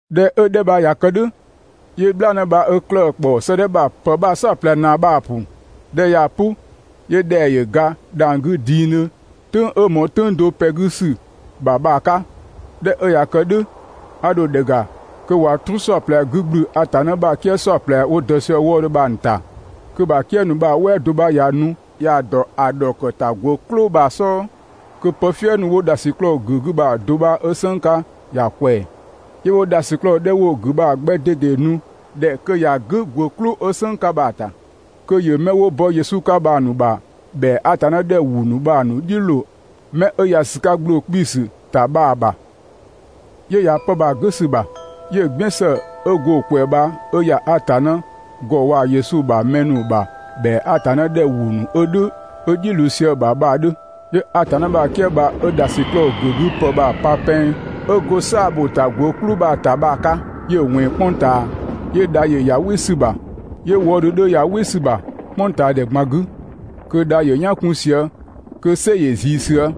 ꞊Dhɛ 'ö‑ 'dhɛ bha ꞊ya kë "dhʋ̈, 'yö "bhlaanë bha 'ö 'klëë‑ ‑kpɔ 'sëëdhɛ ‑bha ‑pë bha‑ "saɔplɛ ‑naa bha‑ ‑pʋ. ꞊Dhɛ 'ö ꞊yaa‑ "pʋ, 'yö ‑dhɛa ‑yö ga dhang‑ 'gü dingdhö "tʋ̈ng 'ö ꞊mɔɔ "tʋ̈ng do ‑pɛ 'gü ‑sü ‑bha bha‑ 'ka. ꞊Dhɛ 'ö ꞊ya kë "dhʋ̈, 'a dho ‑dhɛ ‑ga, kö ꞊wa "truu "saɔplɛ 'gü ꞊gblü Atanna ‑bha "kië "saɔplɛ 'wo dɔ sië‑ wëëdhö bha‑ ‑nu ‑ta. Kö‑ ‑bha "kië ‑nu bha‑ "wɛɛ do 'bha ꞊ya nu ꞊ya dɔ ‑dhɔkëtagwë "klʋ bha‑ "sɔɔ, kö pë "fië 'wo ‑dhasiklɔɔ ‑gʋ̈ 'gü bha‑ do 'ö "sënng 'ka ꞊ya ꞊kwɛɛ‑. 'Yö 'wo ‑dhasiklɔɔ 'dhɛ 'wo‑ ‑gʋ̈ bha‑ 'gbɛ ꞊dede nu‑ ‑dhɛ kö ‑ya "gʋ̈ ‑gwë "klʋ 'ö "sënng 'ka bha‑ ‑ta, kö ‑yö 'mɛ 'wo bɔ Yesu 'ka bha‑ ‑nu ‑bha ‑bhɛa Atanna ‑dhɛ ‑wʋ ‑nu bha‑ ‑nu "dhiʋ̈ ꞊loo 'mɛ 'ö ‑ya ‑sü 'ka ‑gbloo 'kpiisü ‑ta bha‑ ‑bha. 'Yö ‑ya 'pë bha‑ "gʋ̈ ‑sü ‑bha, 'yö‑ "gbiën ‑së 'ö go‑ ꞊kwɛɛ bha 'ö ‑ya Atanna ‑gɔ waa‑ Yesu ‑bha mɛ ‑nu ‑bha ‑bhɛa Atanna ‑dhɛ ‑wʋ ‑nu 'ö‑ "dhiʋ̈ ꞊loo sië‑ ‑bha bha‑ 'dhö. 'Yö Atanna ‑bha "kië bha 'ö ‑dhasiklɔɔ ‑gʋ̈ 'gü ‑pë bha‑ pa pɛng 'ö go "saa‑ ‑bho ‑ta ‑gwë "klʋ bha‑ ‑ta bha‑ 'ka, 'yö‑ ꞊wɛnng "kpʋng ꞊taa. 'Yö dha ‑yö ‑ya "wɩ ‑sü ‑bha, 'yö wɔɔdhö 'dhö ‑ya "wɩ ‑sü ‑bha "kpʋngtaadhɛ ꞊gban 'gü, kö dha ‑yö "yan 'kun sië, kö "sɛ ‑yö ꞊zii sië.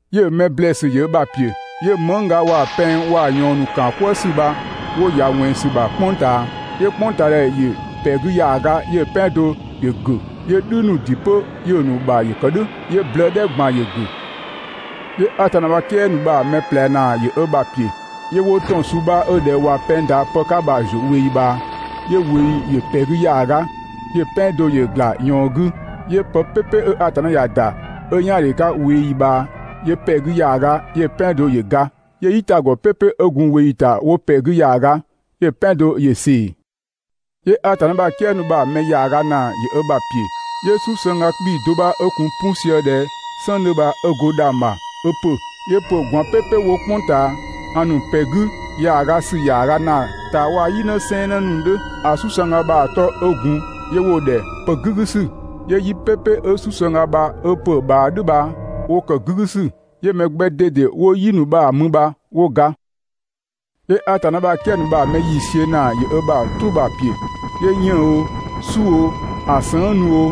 'Yö‑ mɛ ‑blɛɛsü ‑yö ö ‑bha ‑piö. 'Yö mëngga waa‑ pɛng waa‑ ꞊yɔɔn ‑nu ‑kaan "kwëë ‑sü bha 'wo ‑ya ꞊wɛnng ‑sü ‑bha "kpʋng ꞊taa. 'Yö "kpʋngtaadhɛ ‑yö 'pɛ 'gü ‑yaaga, 'yö‑ "pɛan do ‑yö ‑gʋ̈, 'yö "dhü ‑nu ‑dɩ 'pö‑ ‑nu ‑bha ‑yö ‑kë "dhʋ̈, 'yö blëë "dhɛ ꞊gban ‑yö ‑gʋ̈. 'Yö Atanna ‑bha "kië ‑nu bha‑ mɛ ꞊plɛ ‑naa ‑yö ö ‑bha ‑piö. 'Yö 'wo ‑tɔn suu bha 'ö ꞊dhɛ ꞊wa pɛng ‑da pë 'ka bha‑ ‑zuö ꞊weeyi ꞊bhaa. 'Yö ꞊weeyi ‑yö ‑pɛ 'gü ‑yaaga, 'yö‑ "pɛan do ‑yö ‑gla ꞊yɔɔn 'gü, 'yö pë "pɛpɛ 'ö Atanna ‑ya ‑da, 'ö "yaandhe 'ka ꞊weeyi ꞊bhaa, 'yö ‑pɛ 'gü ‑yaaga, 'yö‑ "pɛan do ‑yö ga, 'yö "yitagɔ "pɛpɛ 'ö gun ꞊weeyi ‑ta 'wo ‑pɛ 'gü ‑yaaga, 'yö‑ "pɛan do ‑yö ꞊see. 'Yö Atanna ‑bha "kië ‑nu bha‑ mɛ ‑yaaga ‑naa ‑yö ö ‑bha ‑piö, 'yö "susëngga 'kpii‑ do 'bha 'ö gun 'pu sië ꞊dhɛ "sɔng 'dhö bha 'ö go dhang‑ ‑bha 'ö ‑pö. 'Yö ‑pö ꞊gwaan "pɛpɛ 'wo "kpʋng ꞊taa ‑a ‑nu ‑pɛ 'gü ‑yaaga ‑sü ‑yaaga ‑naa ‑ta waa‑ "yi 'në sɛɛnnë ‑nu 'dhö. ‑A "susëngga bha‑ 'tɔ 'ö gun 'yö 'wo‑ ‑dhɛ «pë "gügüsü». 'Yö "yi "pɛpɛ 'ö "susëngga bha ö ‑pö ꞊bhaa "dhʋ̈ bha 'wo ‑kë "gügüsü, 'yö mɛ 'gbɛ ꞊dede 'wo "yi ‑nu bha‑ mü bha 'wo ga. 'Yö Atanna ‑bha "kië ‑nu bha‑ mɛ ‑yiisiö ‑naa ‑yö ö ‑bha "truu bha‑ ‑piö. 'Yö 'yënng‑ oo, "su oo, ‑a sëng' ‑nu oo,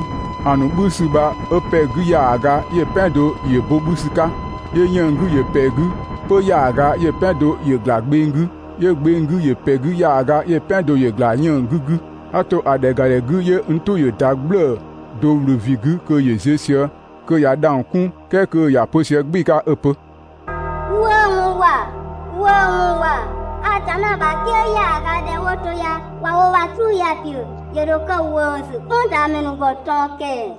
‑a ‑nu 'bhü ‑sü bha 'ö ‑pɛ 'gü ‑yaaga, 'yö‑ "pɛan do ‑yö bo 'bhü ‑sü 'ka. 'Yö 'yënng‑ 'gü ‑yö ‑pɛ 'gü 'pö ‑yaaga, 'yö‑ "pɛan do ‑yö ‑gla gbeng 'gü, 'yö gbeng 'gü ‑yö ‑pɛ 'gü ‑yaaga, 'yö‑ "pɛan do ‑yö ‑gla 'yënng‑ 'gü 'gü. A ‑to ‑a ‑dhɛ ‑ga ‑dhɛ 'gü 'yö n "tʋ ‑yö ‑da "gblëë‑ do ‑wlö ‑vin 'gü kö ‑yö ziö sië, kö ꞊ya dhang‑ 'kun "kɛɛ kö ‑ya pö sië "gbɩɩ‑ 'ka 'ö‑ pö: «‑Wëëwɔn ‑wa! ‑Wëëwɔn ‑wa! Atanna ‑bha "kië ‑yaaga 'dhɛ 'wo to ya ꞊wa wo ‑bha "truu ya‑ ‑piö ‑yö ‑dho kë ‑wëësü "kpʋngtaamɛ ‑nu ‑gɔ ꞊tɔn ‑kɛɛ!»